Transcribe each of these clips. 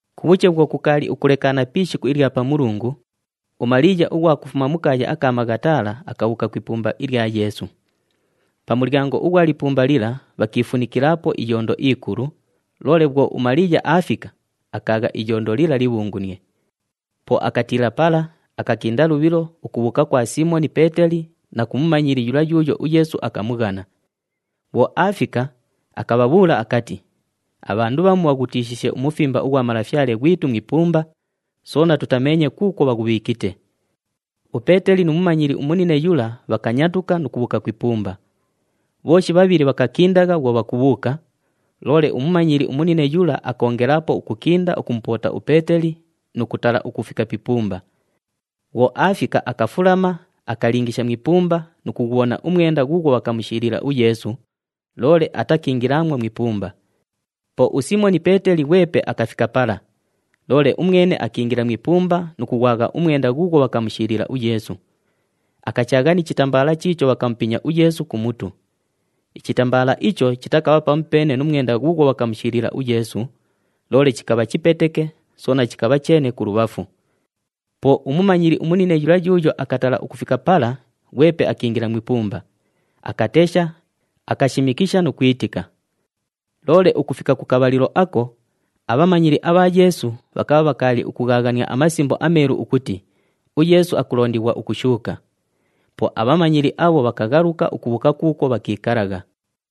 Kubhuche bhwo kukaali ukulekaana pi ishiku ilya Pamulungu, uMaliiya ughwa kufuma mu kaaya aka Maghatala akabhuuka ku ipumba ilya Yeesu. Pa mulyango ughwa lipumba lila bhakiifunikilaapo iyondo ikulu, loole bhwo uMaliiya aafika, akaagha iyondo lila libhungunie. Po akatiila pala, akakinda lubhilo ukubhuuka kwa Siimoni Peeteli na ku mumanyili yula yuuyo uYeesu akamughana. Bhwo aafika, akabhabhuula akati, “Abhandu bhamu bhaghutiishiishe umufimba ughwa Malafyale ghwitu mu ipumba, soona tutameenye kuukwo bhaghubhiikite!” UPeeteli nu mumanyili umunine yula bhakanyatuka nu kubhuuka ku ipumba. Bhooshi bhabhili bhakakindagha bhwo bhakubhuuka, loole umumanyili umunine yula akoongelaapo ukukinda ukumupoota uPeeteli nu kutala ukufika pi ipumba. Bhwo aafika, akafulama, akalingisha mu ipumba nu kughubhona umwenda ghuughwo bhakamushiilila uYeesu, loole atakiingilaamwo mu ipumba. Po uSiimoni Peeteli ghwepe akafika pala, loole umwene akiingila mu ipumba nu kughwagha umwenda ghuughwo bhakamushiilila uYeesu. Akachaagha ni chitambaala chiicho bhakamupinya uYeesu ku mutu. Ichitambaala icho chitakabha pamupeene nu mwenda ghuughwo bhakamushiilila uYeesu, loole chikabha chipeteke, soona chikabha cheene kulubhafu. Po umumanyili umunine yula yuuyo akatala ukufika pala ghwepe akiingila mu ipumba, akatesha, akashimikisha nu kwitika. Loole ukufika ku kabhalilo ako, abhamanyili abha Yeesu bhakabha bhakaali ukughaaghania aMasimbo aMeelu ukuti uYeesu akulondighwa ukushuuka. Po abhamanyili abho bhakaghaluka ukubhuuka kuukwo bhakiikalagha.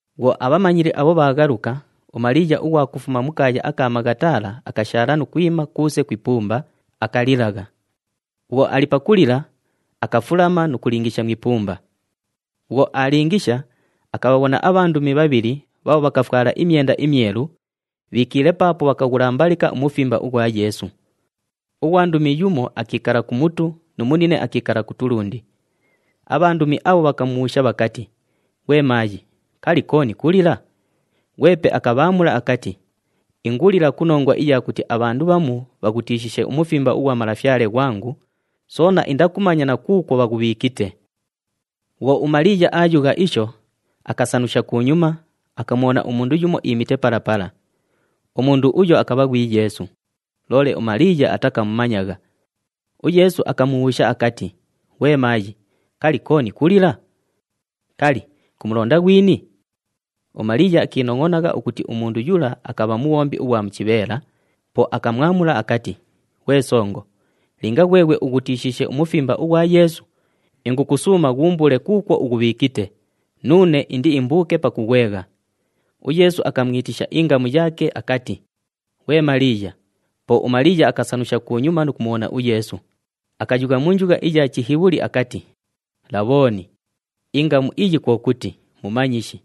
Bhwo abhamanyili abho bhaaghaluka, uMaliiya ughwa kufuma mu kaaya aka Maghatala akashaala nu kwima kuuse ku ipumba, akalilagha. Bhwo ali pakulila, akafulama nu kulingisha mu ipumba. Bhwo aalingisha, akabhabhona abhandumi bhabhili bhaabho bhakafwala imyenda imyelu, bhiikiile paapo bhakaghulambalika umufimba ughwa Yeesu. Ughwandumi yumo akiikala ku mutu nu munine akiikala ku tulundi. Abhandumi abho bhakamubhuusha bhakati, “Ghwe maayi, kali, kooni kulila?” Ghwepe akabhaamula akati, “Ingulila ku nongwa iya kuti abhandu bhamu bhaghutiishiishe umufimba ughwa Malafyale ghwangu, soona indakumanya na kuukwo bhaghubhiikite!” Bhwo uMaliiya aayugha isho, akasanusha kunyuma, akamubhona umundu yumo iimite pala pala. Umundu uyo akabha ghwi Yeesu, loole uMaliiya atakamumanyagha. UYeesu akamubhuusha akati, “Ghwe maayi, kali, kooni kulila? Kali, kumulonda ghwini?” UMaliiya akiinongʼonagha ukuti umundu yula akabha mubhombi ughwa mu chibheela, po akamwamula akati, “Ghwe songo, linga ghweghwe ughutishiishe umufimba ughwa Yeesu, ingukusuuma ghuumbuule kuukwo ughubhiikite, nuune indiimbuuke pakughwegha.” UYeesu akamwitisha ingamu yaake akati, “Ghwe Maliiya!” Po uMaliiya akasanusha kunyuma nu kumubhona uYeesu, akayugha mu njugha iya Chihibhuli akati, “Labhooni!” ingamu iyi kwo kuti, “Mumanyishi.”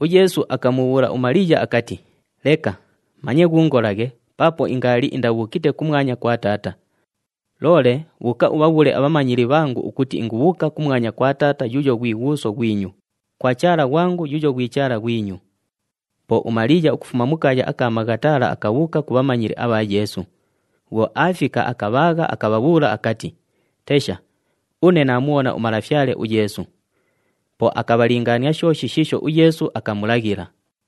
UYeesu akamubhuula uMaliiya akati, “Leka, manye ghuungolaghe paapo ingaali indabhuukite kumwanya kwa Taata. Loole bhuuka ubhabhuule abhamanyili bhangu ukuti ingubhuuka kumwanya kwa Taata yuuyo ghwi Ghuuso ghwinyu, kwa Chaala ghwangu yuuyo ghwi Chaala ghwinyu.” Po uMaliiya ukufuma mu kaaya aka Maghatala akabhuuka ku bhamanyili abha Yeesu. Bhwo aafika, akabhaagha, akabhabhuula akati, “Tesha, une naamubhona uMalafyale uYeesu!” Po akabhalingaania shooshi shiisho uYeesu akamulaghila.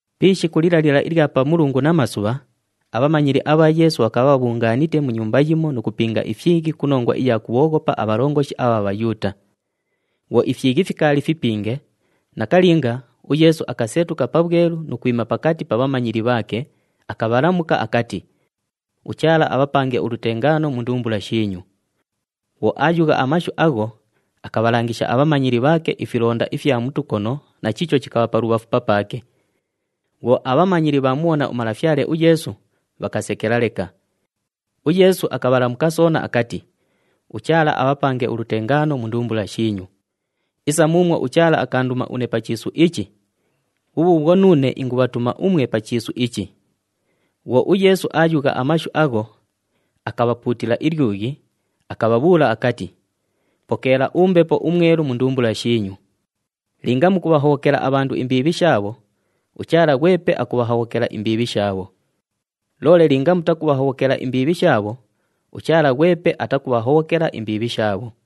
Pi ishiku lila lila ilya Pamulungu namasubha, abhamanyili abha Yeesu bhakabha bhabhungaanite mu nyumba yimo nu kupinga ifyighi ku nongwa iya kubhooghopa abhalongoshi abha Bhayuuta. Bhwo ifyighi fikaali fipinge, nakalinga, uYeesu akasetuka pabhwelu nu kwima pakati pa bhamanyili bhaake, akabhalamuka akati, “UChaala abhapange ulutengaano mu ndumbula shiinyu.” Bhwo aayugha amashu agho, akabhalangisha abhamanyili bhaake ifilonda ifya mu tukono na chiicho chikabha pa lubhafu papaake. Bhwo abhamanyili bhaamubhona uMalafyale uYeesu, bhakasekela leka. UYeesu akabhalamuka soona akati, “UChaala abhapange ulutengaano mu ndumbula shiinyu. Isa muumwo uChaala akaanduma une pa chiisu ichi, bhubhuubhwo nuune ingubhatuma umwe pa chiisu ichi.” Bhwo uYeesu aayugha amashu agho, akabhapuutila ilyughi, akabhabhuula akati, “Pokeela uMbepo uMwelu mu ndumbula shiinyu. Linga mukubhahobhokela abhandu imbiibhi shaabho, uChaala ghwepe akubhahobhokela imbiibhi shaabho. Loole linga mutakubhahobhokela imbiibhi shaabho, uChaala ghwepe atakubhahobhokela imbiibhi shaabho.”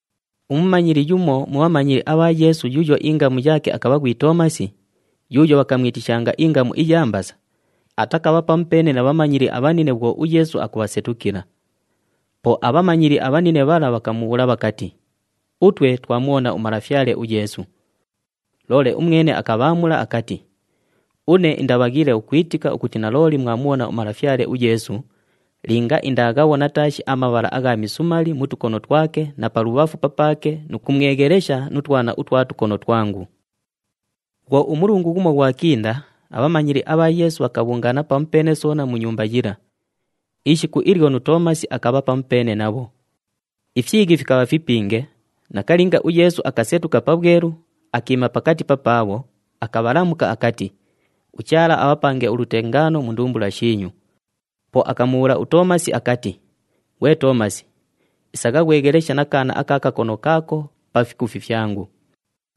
Umumanyili yumo mu bhamanyili abha Yeesu yuuyo ingamu yaake akabha ghwi Toomasi, yuuyo bhakamwitishanga ingamu iya Mbasa, atakabha pamupeene na bhamanyili abhanine bhwo uYeesu akubhasetukila. Po abhamanyili abhanine bhala bhakamubhuula bhakati, “Utwe twamubhona uMalafyale uYeesu.” Loole umwene akabhaamula akati, “Une indabhaghiile ukwitika ukuti nalooli mwamubhona uMalafyale uYeesu linga indaaghabhona taashi amabhala agha misumali mu tukono twake na pa lubhafu papaake nu kumweghelesha nu twana utwa tukono twangu.” Bhwo umulungu ghumo ghwakinda, abhamanyili abha Yeesu bhakabhungaana pamupeene soona mu nyumba yila. Ishiku ilyo nu Toomasi akabha pamupeene nabho. Ifyighi fikabha fipinge, nakalinga, uYeesu akasetuka pabhwelu, akiima pakati papaabho, akabhalamuka akati, “UChaala abhapange ulutengaano mu ndumbula shiinyu.” Po akamubhuula uToomasi akati, “Ghwe Toomasi, isagha ghwegheleshe na kaana aka kakono kaako pa fikufi fyangu.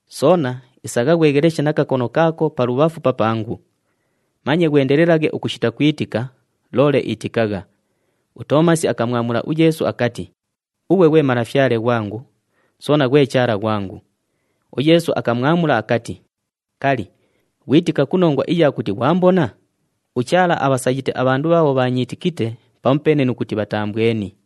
Soona isagha ghwegheleshe na kakono kaako pa lubhafu papangu. Manye ghwendelelaghe ukushita kwitika, loole itikagha.” UToomasi akamwamula uYeesu akati, “Ughwe ghwe Malafyale ghwangu, soona ghwe Chaala ghwangu!” UYeesu akamwamula akati, “Kali, ghwitika ku nongwa iya kuti ghwambona? UChaala abhasayite abhandu bhaabho bhaanyiitikite pamupeene nu kuti bhataambweni.”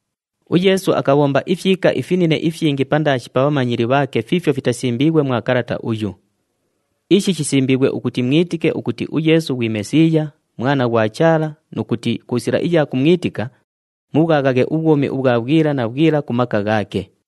UYeesu akabhomba ifyika ifinine ifyingi pandaashi pa bhamanyili bhaake fiifyo fitasimbiighwe mwa kalata uyu. Ishi shisimbiighwe ukuti mwitike ukuti uYeesu ghwi Mesiiya, Mwana ghwa Chaala nu kuti ku sila iya kumwitika, mubhwaghaghe ubhwumi ubhwa bhwila na bhwila ku maka ghaake.